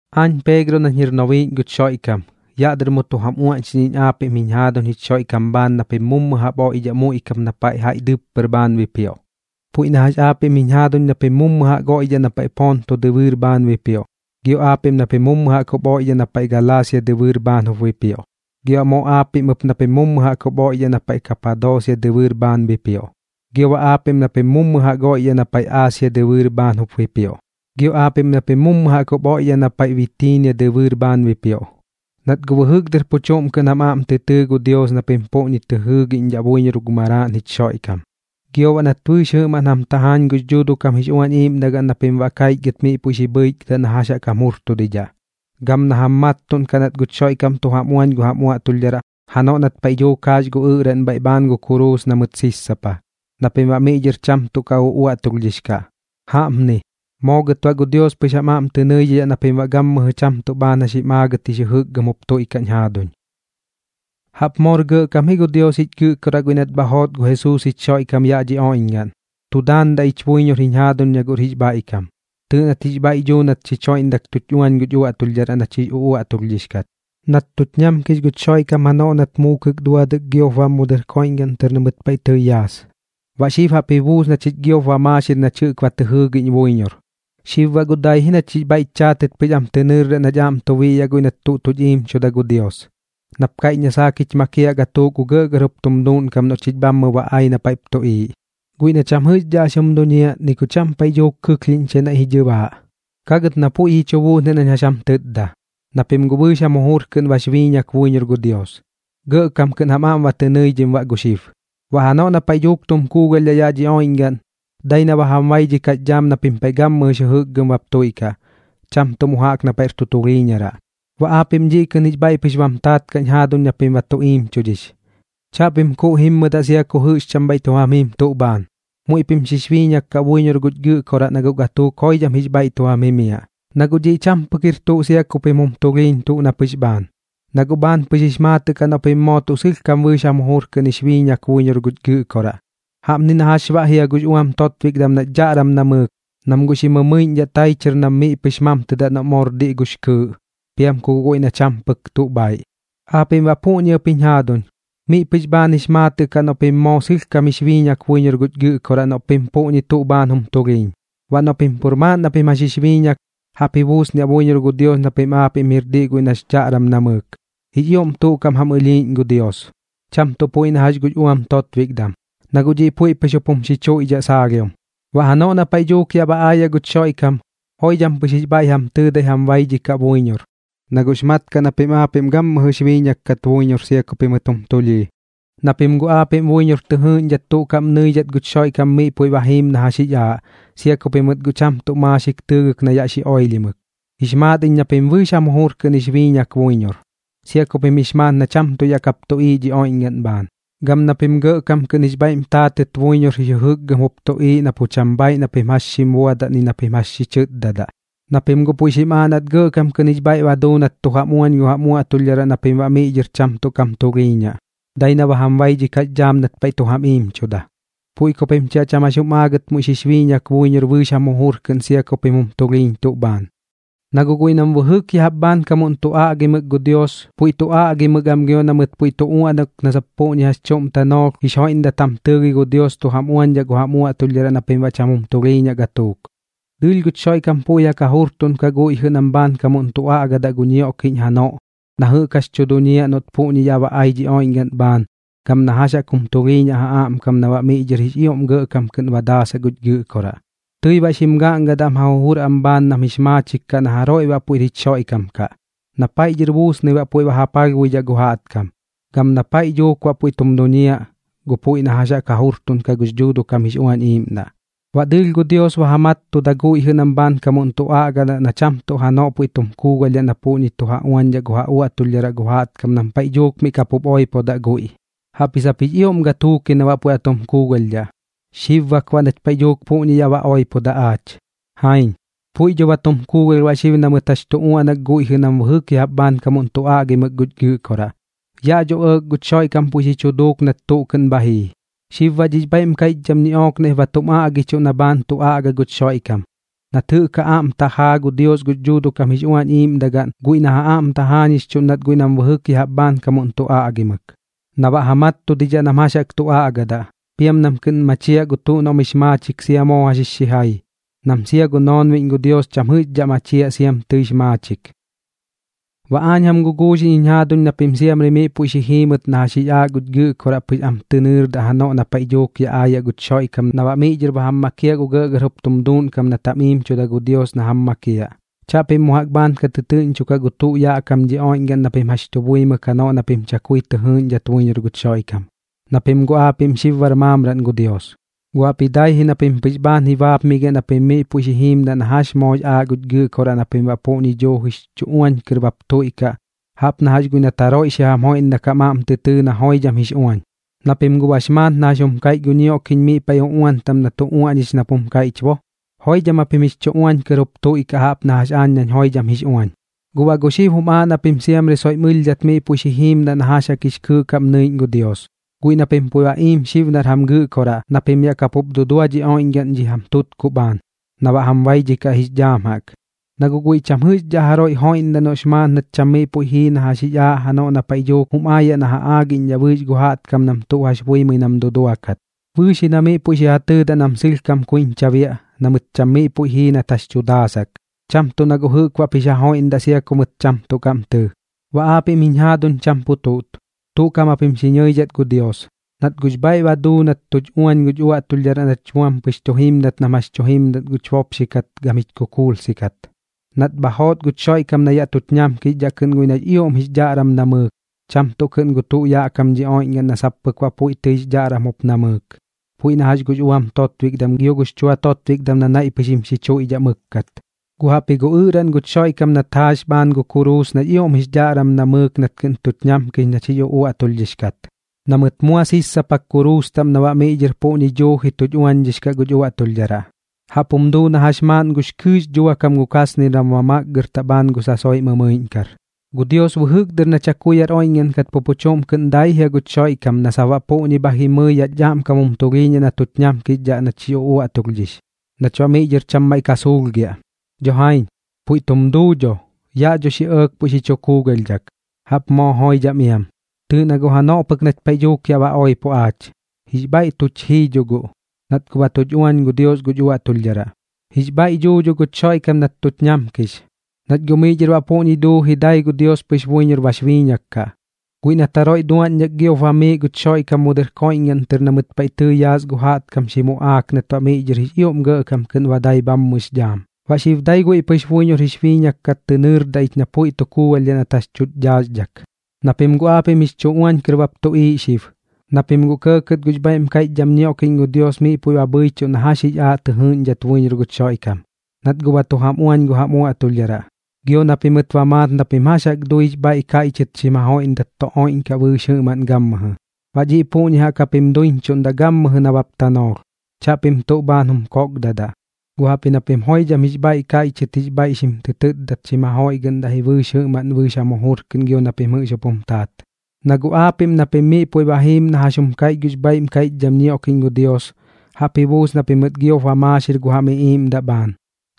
Aañ Peegro nañ jir nobiiꞌñ guch Xoiꞌkam, yaꞌ dɨr mu tu jam uaꞌñxiꞌñ iñ aapiꞌm jiñ jaaduñ jich Xoiꞌkam bhaan na pim mummu jaꞌp oiꞌdhaꞌ muiꞌ kap na paiꞌ jaiꞌ dɨppɨr bhaan bipioꞌ, puiꞌ na jax aapiꞌm jiñ jaaduñ na pim mummu jaꞌk oiꞌdhaꞌ na paiꞌ Ponto dɨbɨɨr bhaan bipioꞌ, gio aapiꞌm na pim mummu jaꞌk jup oiꞌdhaꞌ na paiꞌ Galaasia dɨbɨɨr bhaan jup bipioꞌ, gio baꞌ moo aapiꞌm ɨp na pim mummu jaꞌk oiꞌdhaꞌ na paiꞌ Kapadoosia dɨbɨɨr bhaan bipioꞌ, gio baꞌ aapiꞌm na pim mummu jaꞌk oiꞌdhaꞌ na paiꞌ Aasia dɨbɨɨr bhaan jup bipioꞌ, gio aapiꞌm na pim mummu jaꞌk jup oidhaꞌ na paiꞌ Bitiinia dɨbɨɨr bhaan bipioꞌ. Nat guꞌ bɨjɨk dɨr pu chuꞌm kɨꞌn jam aꞌm tɨ tɨɨ gu Dios na pim puꞌñi tɨ jɨɨꞌñdhaꞌ buiñor gu Maraaꞌn jich Xoiꞌkam, gio baꞌ nat bɨɨx jɨꞌmaꞌn jam tajaañ gux Dhuuduꞌ kam jix Uañ Iiꞌmdagaꞌn na pim baꞌ kaichgɨt miꞌ puiꞌ xi bhɨichgɨdaꞌ na jax jaꞌk jam jurtudidhaꞌ, gam na jam mattuꞌnkaꞌ nat guch Xoiꞌkam tu jam uañ gu jam uaꞌtulhdharaꞌ janoꞌ nat paiꞌ dhuuk jaax gu ɨꞌraꞌn bhaiꞌ bhaan gu kuruus na mɨt sissapa, na pim baꞌ miꞌ dhɨr cham tuꞌ ka uaꞌtulhdhix kaꞌ. Jaꞌpni, moo gɨt baꞌ gu Dios pɨx jam aꞌm tɨ nɨidhidhaꞌ na pim baꞌ gammɨjɨ cham tuꞌ bhaan jax jim aagɨt jix jɨjɨkgɨm jup tuiꞌkaꞌñ jaaduñ. Jaꞌp moor gɇꞌkam ji gu Dios jich Gɨꞌkoraꞌ guiꞌ nat bha joot gu Jesuus jich Xoiꞌkam yaꞌ dhi oiꞌñgaꞌn, tu daandaꞌ ich buiñor jiñ jaaduñ na guꞌr jix bhaiꞌkam. Tɨɨꞌ nat jix bhaiꞌ duu nat xich joiꞌndak tuch uañ guch uaꞌtulhdharaꞌ nach jix uꞌuaꞌtulhdhix kat, nat tuch ñamkix guch Xoiꞌkam janoꞌ nat muukɨk duadɨk giop bam mu dɨr koiꞌñgaꞌn tɨr na mɨt paiꞌ tɨi yaas. Baꞌ xib jaꞌp ji buus na chich giop ba maaxir nach jɨꞌk ba tɨ jɨɨgiꞌñ buiñor, xib baꞌ guꞌ dai ji nach jix bhaiꞌch chaatɨt pɨx am tɨ nɨɨrdaꞌ nach aꞌm tu biꞌyaꞌ guiꞌ nat tuch iimchuda gu Dios, nap kaiꞌch na saak jich makiaꞌ gatuuk gu gɇꞌgɇr jup tum duuꞌnkam noꞌ chich bhammɨ ba ai na paiꞌp tuꞌiiꞌ, guiꞌ na cham jɨꞌxdhaꞌ jax jum duñiaꞌ ni gu cham paiꞌ dhuuk kɨlhiiꞌñchai naiꞌ ji dhɨbaaꞌ. Ka gɨt na guꞌ puiꞌ ji chu buusniaꞌ nañ jax jam tɨtda, na pim guꞌ bɨɨx jam jujur kɨꞌn bax biiñak buiñor gu Dios, gɇꞌkam kɨꞌn jam aꞌm ba tɨ nɨidhim baꞌ gu xib. Baꞌ janoꞌ na paiꞌ dhuuk tum kuugalhdhaꞌ yaꞌ dhi oiꞌñgaꞌn, dai na ba jam baidhikaꞌx dhaam na pim paiꞌ gammɨjɨx jɨjɨkgɨm bap tuiꞌkaꞌ, cham tuꞌ mu jaꞌk na paiꞌr tu tulhiiñaraꞌ. Baꞌ aapiꞌm dhiꞌ kɨꞌn jix bhaiꞌ pɨx bam taat kaꞌñ jaaduñ na pim ba tu iimchudhix, chaꞌpim kuuꞌ jimmɨdaꞌ sia ku jɨꞌx cham bhaiꞌ tu jam jim tuꞌ bhaan. Muiꞌ pim xix biiñak kaꞌ buiñor guch Gɨꞌkoraꞌ na guꞌ gatuuk joidham jix bhaiꞌ tu jam jimiaꞌ. Na guꞌ dhiꞌ cham pɨk jir tuꞌ sia ku pim jum tulhiiñ tuꞌ na pɨx bhaan, na guꞌ bhaan pɨx jix maatɨꞌ kaꞌ noꞌ pim moo tuꞌ sɨlhkam bɨɨx jam jujur kɨꞌn jix biiñak buiñor guch Gɨꞌkoraꞌ. Jaꞌpni na jax baꞌ jia gux uam totbikdam nax dhaꞌram namɨɨk, nam guꞌ xi mɨmɨiꞌñdhaꞌ tai chɨr nam miꞌ pɨx mamtɨdaꞌ noꞌ moor diꞌ gux kɨɨꞌ, piam ku guꞌ guiꞌ na cham pɨk tuꞌ bhaiꞌ. Aapiꞌm baꞌ puꞌñi ɨp jiñ jaaduñ, miꞌ pɨx bhaan jix maatɨꞌ kaꞌ noꞌ pim moo sɨlhkam jix biiñak buiñor guch Gɨꞌkoraꞌ noꞌ pim puꞌñi tuꞌ bhaan jum tulhiiñ. Baꞌ noꞌ pim pur maaꞌn na pim jax jix biiñak, jaꞌp ji buusniaꞌ buiñor gu Dios na pim aapiꞌm jir diꞌ guiꞌ nax dhaꞌram namɨɨk. Jix ioꞌm tuꞌ kaꞌm jam ɨlhiiꞌñ gu Dios, cham tuꞌ puiꞌ na jax gux uam totbikdam, na guꞌ dhiꞌ puiꞌ pɨx jup jum xichuiꞌdhaꞌ saalhiom. Baꞌ janoꞌ na paiꞌ dhuuk yaꞌ ba aayaꞌ guch Xoiꞌkam, joidham pɨx jix bhaiꞌ jam tɨɨdai jam baidhikaꞌ buiñor, na guꞌx mat kaꞌ na pim aapiꞌm gammɨjɨx biiñak kat buiñor sia ku pimɨt jum tulhii. Na pim guꞌ aapiꞌm buiñor tɨ jɨɨꞌñdhat tuꞌ kaꞌm nɨidhat guch Xoiꞌkam miꞌ puiꞌ ba jiim na jax jix aaꞌ, sia ku pimɨt cham tuꞌ maaxik tɨɨgɨk na yaꞌ xi oilhimɨk. Jix maat iñ na pim bɨɨx jam jujur kɨꞌn jix biiñak buiñor, sia ku pim jix maat na cham tuꞌ yaꞌ kap tuꞌiiꞌ dhi oiꞌñgaꞌn bhaan, gam na pim gɇꞌkam kɨꞌn jix bhaiꞌm taatɨt buiñor jix jɨjɨkgɨm jup tuꞌiiꞌ na pu cham bhaaiꞌ na pim jax xim buadaꞌ ni na pim jax xi chɨtdadaꞌ, na pim puiꞌ xim aaꞌ nat gɇꞌkam kɨꞌn jix bhaiꞌ ba duu nat tu jam uañ gu jam uaꞌtulhdharaꞌ na pim baꞌ miꞌ dhɨr cham tuꞌ kam tulhiiñaꞌ, dai na ba jam baidhikaꞌx dhaam nat paiꞌ tu jam iimchuda. Puiꞌ ku pim chi baꞌ cham jax jum aagɨt muiꞌ xix biiñak buiñor bɨɨx jam jujur kɨꞌn sia ku pim jum tulhiiñ tuꞌ bhaan. Na guꞌ guiꞌ nam bɨjɨk ya jaꞌp bhaankamuꞌn tu aꞌgimɨk gu Dios, puiꞌ tu aꞌgimɨk am gio na mɨt puiꞌ tu uaꞌnak na sap puꞌñi jax chuꞌm tanoolh jix joiꞌndat jam tɨɨgɨi gu Dios tu jam uañdhaꞌ gu jam uaꞌtulhdharaꞌ na pim baꞌ cham jum tulhiiñaꞌ gatuuk. Dɨɨlh guch Xoiꞌkam puiꞌ jaꞌk ja jurtuꞌnkaꞌ guiꞌ jɨꞌ nam bhaankamuꞌn tu aꞌgadaꞌ gu ñioꞌkiꞌñ janoꞌ, na jɨꞌk jax tu duñiaꞌ noꞌt puꞌñi yaꞌ ba ai dhi oiꞌñgaꞌn bhaan, gam na jax jaꞌk jum tulhiiñaꞌ ja aꞌmkam na baꞌ miꞌ dhɨr jix ioꞌm gɇꞌkam kɨꞌn ba daasaꞌ guch Gɨꞌkoraꞌ. Tɨi baꞌ xim gaꞌngadaꞌ am ja jujur am bhaan nam jix maachik kaꞌ na jaroiꞌ baꞌ puiꞌr jich Xoiꞌkam kaꞌ, na paiꞌ dhɨr buusnɨi baꞌ puiꞌ ba ja palhbuidhaꞌ gu jaꞌtkam, gam na paiꞌ dhuuk baꞌ puiꞌ tum duñiaꞌ gu puiꞌ na jax ja jurtuꞌnkaꞌ gux Dhuuduꞌ kam jix Uañ Iiꞌmdaꞌ. Baꞌ dɨɨlh gu Dios ba ja mattuda guiꞌ jɨꞌ nam bhaankamuꞌn tu aꞌgadaꞌ na cham tuꞌ janoꞌ puiꞌ tu kuugalhdhaꞌ na puiꞌ tu ja uañdhaꞌ gu ja uaꞌtulhdharaꞌ gu jaꞌtkam nam paiꞌ dhuuk miꞌ kapup oipodaꞌ guiꞌ. Jaꞌpji sap jix ioꞌm gatuuk ji na baꞌ puiꞌ ba tu kuugalhdhaꞌ, xib bak baꞌ nach paiꞌ dhuuk puꞌñi yaꞌ ba oipodaꞌ aach. Jaiñ, puiꞌ dho ba tum kuugalh baꞌ xib na mɨt jɨꞌk jax tu uaꞌnak guiꞌ jɨꞌ nam bɨjɨk ya jaꞌp bhaankamuꞌn tu aꞌgimɨk guch Gɨꞌkoraꞌ. Yaꞌ dho ɇɇk guch Xoiꞌkam puiꞌ xi chu duuk nat tuꞌ kɨꞌn bha jii. Xib baꞌ dhix bhaiꞌm kaiꞌchdham ñiꞌook naiꞌp ba tum aꞌgichuꞌ na bhaan tu aꞌga guch Xoiꞌkam, nat jɨꞌk ja aꞌm tajaa gu Dios gux Dhuuduꞌ kam jix Uañ Iiꞌmdagaꞌn guiꞌ na ja aꞌm tajaañixchuꞌndat guiꞌ nam bɨjɨk ya jaꞌp bhaankamuꞌn tu aꞌgimɨk, na baꞌ ja mattudidhaꞌ nam jax jaꞌk tu aꞌgadaꞌ, piam nam kɨꞌn machiaꞌ gu tuꞌ noꞌm jix maachik sia moo jax jix xijai, nam sia gu noonbiꞌñ gu Dios cham jɨꞌxdhaꞌ machiaꞌ siam tɨix maachik. Baꞌ aañ jam guguuxiꞌñ jiñ jaaduñ na pim siamri miꞌ puiꞌ xi jiimɨt na jax jix aaꞌ guch Gɨꞌkoraꞌ pɨx am tɨ nɨɨrdaꞌ janoꞌ na paiꞌ dhuuk yaꞌ aayaꞌ guch Xoiꞌkam na baꞌ miꞌ dhɨr ba jam makiaꞌ gu gɇꞌgɇr jup tum duuꞌnkam nat jam iimchuda gu Dios na jam makiaꞌ. Chaꞌpim mu jaꞌk bhaan ka tɨtɨɨꞌñchokaꞌ gu tuꞌ yaꞌ kam dhi oiꞌñgaꞌn na pim jax tu buimɨk janoꞌ na pim chakui tɨ jɨɨꞌñdhat buiñor guch Xoiꞌkam, na pim guꞌ aapiꞌm xib bar maamraꞌn gu Dios. Guꞌ jaꞌpji dai ji na pim pɨx bhaan ji baapmigiaꞌ na pim miꞌ puiꞌ xi jiimdaꞌ na jax jaꞌk moox aaꞌ guch Gɨꞌkoraꞌ na pim baꞌ puꞌñi duujix chu uañ kɨr bap tuiꞌkaꞌ jaꞌp na jax guiꞌ nat jaroiꞌ xi jam joiꞌndak jam aꞌm tɨ tɨɨ na joidham jix uañ. Na pim guꞌ bax maat na jax jum kaiꞌch gu ñioꞌkiꞌñ miꞌ paiꞌ uꞌuan taꞌm na tu uaꞌñix nap jum kaiꞌch bo: “Joidham japim jix chu uañ kɨr jup tuiꞌkaꞌ jaꞌp na jax aañ nañ joidham jix uañ.” Guꞌ baꞌ gu xib jum aaꞌ na pim siamri soiꞌm ɨlhdhat miꞌ puiꞌ xi jiimdaꞌ na jax jaꞌk jix kɨɨꞌ kaꞌm nɨiꞌñ gu Dios, guiꞌ na pim puiꞌ ba iim xib nar jam Gɨꞌkoraꞌ, na pim yaꞌ kapup dudua dhi oiꞌñgaꞌn dhi jam tutkuꞌ bhaan, na baꞌ jam baidhikaꞌ jix dhaam jaꞌk. Na guꞌ guiꞌ cham jɨꞌxdhaꞌ jaroiꞌ joiꞌndaꞌ noꞌx maat nat cham miꞌ puiꞌ jii na jax jix aaꞌ janoꞌ na paiꞌ dhuuk jum aayaꞌ na ja aagiꞌñdhaꞌ bɨɨx gu jaꞌtkam nam tuꞌ jax buimɨi nam duduakat. Bɨɨx ji na miꞌ puiꞌ xi ja tɨɨdaꞌ nam sɨlhkam kuiñcha biaꞌ na mɨt cham miꞌ puiꞌ jii nat jax tu daasak, cham tuꞌ na guꞌ jɨꞌk baꞌp jix ja joiꞌgɨꞌndaꞌ sia ku mɨt cham tuꞌ kaꞌm tɨɨ. Baꞌ aapiꞌm jiñ jaaduñ cham pu chuꞌt, tuꞌ kaꞌm japim xi ñɨidhat gu Dios, nat guꞌx bhaiꞌ ba duu nat tuch uañ guch uaꞌtulhdharaꞌ nach buam pɨx tu jimdat nam jax tu jimdat guch bopxi kat gam jich kukuulsi kat, nat bha joot guch Xoiꞌkam na yaꞌ tuch ñamkixdhaꞌ kɨꞌn guiꞌ nax ioꞌm jix dhaꞌram namɨɨk, cham tuꞌ kɨꞌn gu tuꞌ yaꞌ kam dhi oiꞌñgaꞌn na sap pɨk baꞌ puiꞌ tɨix dhaꞌram jup namɨɨk, puiꞌ na jax gux uam totbikdam gio gux chua totbikdam na naiꞌ pɨx jim xichuiꞌdhaꞌ mɨkkat. Guꞌ jaꞌpji gu ɨꞌraꞌn guch Xoiꞌkam nat jaax bhaan gu kuruus nax ioꞌm jix dhaꞌram namɨɨk nat kɨꞌn tuch ñamkix nach jix uꞌuaꞌtulhdhix kat, na mɨt mua sissapak kuruus taꞌm na baꞌ miꞌ dhɨr puꞌñi duuji tuch uañdhix kaꞌ guch uaꞌtulhdharaꞌ. Jaꞌp jum duu na jax maaꞌn gux kɨɨꞌx dhuakam gu kasnir nam ba makgɨrtaꞌ bhaan gu sasoiꞌ mɨmɨiꞌñkar. Gu Dios bɨjɨk dɨr na chakui yaꞌr oiꞌñgaꞌn kaꞌ pu pu chuꞌm kɨꞌn dai jia guch Xoiꞌkam na sap baꞌ puꞌñi bha jimɨi yaꞌch aꞌmkam jum tulhiiñaꞌ na tuch ñamkixdhaꞌ nach jix uꞌuaꞌtulhdhix, nach baꞌ miꞌ dhɨr cham maiꞌ ka suulhgiaꞌ. Dho jaiñ, puiꞌ tum duu dho, yaꞌ dho xi ɇɇk puiꞌ xi chu kuugalhdhak. Jaꞌp moo joidham iam, tɨɨꞌ na guꞌ janoꞌ pɨk nach paiꞌ dhuuk yaꞌ ba oipo aach, jix bhaiꞌ tuch jii dho guꞌ, nat guꞌ ba tuch uañ gu Dios guch uaꞌtulhdharaꞌ. Jix bhaiꞌ duu dho guch Xoiꞌkam nat tuch ñamkix, nach guꞌ miꞌ dhɨr baꞌ puꞌñi duuji dai gu Dios pɨx buiñor bax biiñak kaꞌ, guiꞌ nat jaroiꞌ duaꞌñdhak giop bamiiꞌ guch Xoiꞌkam mu dɨr koiꞌñgaꞌn tɨr na mɨt paiꞌ tɨi yaas gu jaꞌtkam xi muꞌaak nat baꞌ miꞌ dhɨr jix ioꞌm gɇꞌkam kɨꞌn ba dai bhammɨx dhaam. Baꞌ xib dai guiꞌ pim pɨx buiñor jix biiñak kat tɨ nɨɨrdaꞌ na puiꞌ tu kuugalhdhaꞌ nat jax tuch dhaaxdhak. Na pim guꞌ aapiꞌm jix chu uañ kɨr baꞌp tuꞌiiꞌ baꞌ xib, na pim guꞌ kɇɇkɇt gux bhaiꞌm kaiꞌchdham ñioꞌkiꞌñ gu Dios miꞌ puiꞌ ba bhɨichuꞌ na jax jix aaꞌ tɨ jɨɨꞌñdhat buiñor guch Xoiꞌkam, nat guꞌ ba tu jam uañ gu jam uaꞌtulhdharaꞌ, gio na pimɨt ba maat na pim jax jaꞌk dui jix bhaiꞌ kaiꞌchɨt xim jajoiꞌgɨꞌndat tu oiꞌñkaꞌ bɨɨx jɨꞌmaꞌn gammɨjɨ. Baꞌ dhiꞌ puꞌñi jaꞌk japim duiñchuꞌndaꞌ gammɨjɨ nabap tanoolh, chaꞌpim tuꞌ bhaan jum kokdadaꞌ, guꞌ jaꞌpji na pim joidham jix bhaiꞌ kaiꞌchɨt jix bhaiꞌ xim tɨ tɨtdat xim ja joiꞌgɨꞌndaꞌ ji bɨɨx jɨꞌmaꞌn bɨɨx jam jujur kɨꞌn gio na pim jɨꞌx jup jum taat. Na guꞌ aapiꞌm na pim miꞌ puiꞌ ba jiim na jax jum kaiꞌch gux bhaiꞌm kaiꞌchdham ñioꞌkiꞌñ gu Dios, jaꞌp ji buus na pimɨt giop ba maaxir gu jam iꞌiiꞌmdaꞌ bhaan,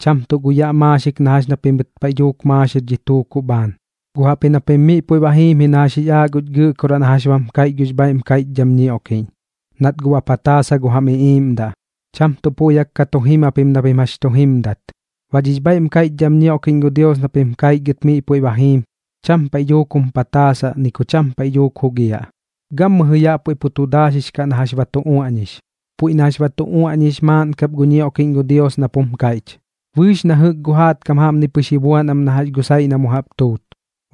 cham tuꞌ gu yaꞌ maaxik na jax na pimɨt paiꞌ dhuuk maaxir dhi tuukuꞌ bhaan. Gu jaꞌpji na pim miꞌ puiꞌ ba jiim ji na jax jix aaꞌ guch Gɨꞌkoraꞌ na jax bam kaiꞌch gux bhaiꞌm kaiꞌchdham ñioꞌkiꞌñ, nat guꞌ ba pataasa gu jam iꞌiiꞌmdaꞌ, cham tuꞌ puiꞌ jaꞌk ka tu jim japim na pim jax chu jimdat. Baꞌ dhix bhaiꞌm kaiꞌchdham ñioꞌkiꞌñ gu Dios na pim kaichgɨt miꞌ puiꞌ ba jiim, cham paiꞌ dhuuk jum pataasaꞌ ni ku cham paiꞌ dhuuk jugiaꞌ, gammɨjɨ yaꞌ puiꞌ pu tu daaxix kaꞌ na jax ba tu uaꞌñix. Puiꞌ na jax ba tu uaꞌñix maaꞌn kap gu ñioꞌkiꞌñ gu Dios nap jum kaiꞌch: Bɨɨx na jɨꞌk gu jaꞌtkam jaꞌpni pɨx ji buan am na jax gu saiꞌ na mu jaꞌp tuut.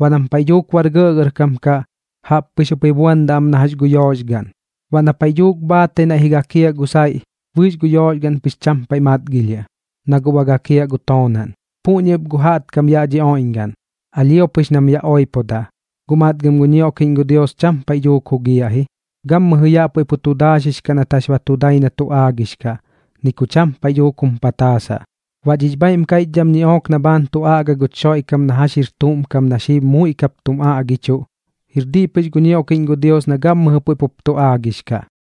Baꞌ nam paiꞌ dhuuk bar gɇꞌgɇrkam kaꞌ, jaꞌp pɨx jup ji buandaꞌ am na jax gu yooxgaꞌn. Baꞌ na paiꞌ dhuuk bhaatai naiꞌ ji gakiaꞌ gu saiꞌ, bɨɨx gu yooxgaꞌn pɨx cham paiꞌ matgilhiaꞌ, na guꞌ ba gakiaꞌ gu toonaꞌn. Puꞌñi ɨp gu jaꞌtkam yaꞌ dhi oiꞌñgaꞌn, alhio pɨx nam yaꞌ oipodaꞌ, guꞌ matgam gu ñioꞌkiꞌñ gu Dios cham paiꞌ dhuuk jugiaꞌ ji, gammɨjɨ yaꞌ puiꞌ pu tu daaxix kaꞌ nat jax ba tu dai na tu aagix kaꞌ, ni ku cham paiꞌ dhuuk jum pataasaꞌ. Baꞌ dhix bhaiꞌm kaiꞌchdham ñiꞌook na bhaan tu aꞌga guch Xoiꞌkam na jax jir tuꞌm kam na xib muiꞌ kap tum aꞌgichuꞌ, jir diꞌ pɨx gu ñioꞌkiꞌñ gu Dios na gammɨjɨ puiꞌ pup tu aagix kaꞌ.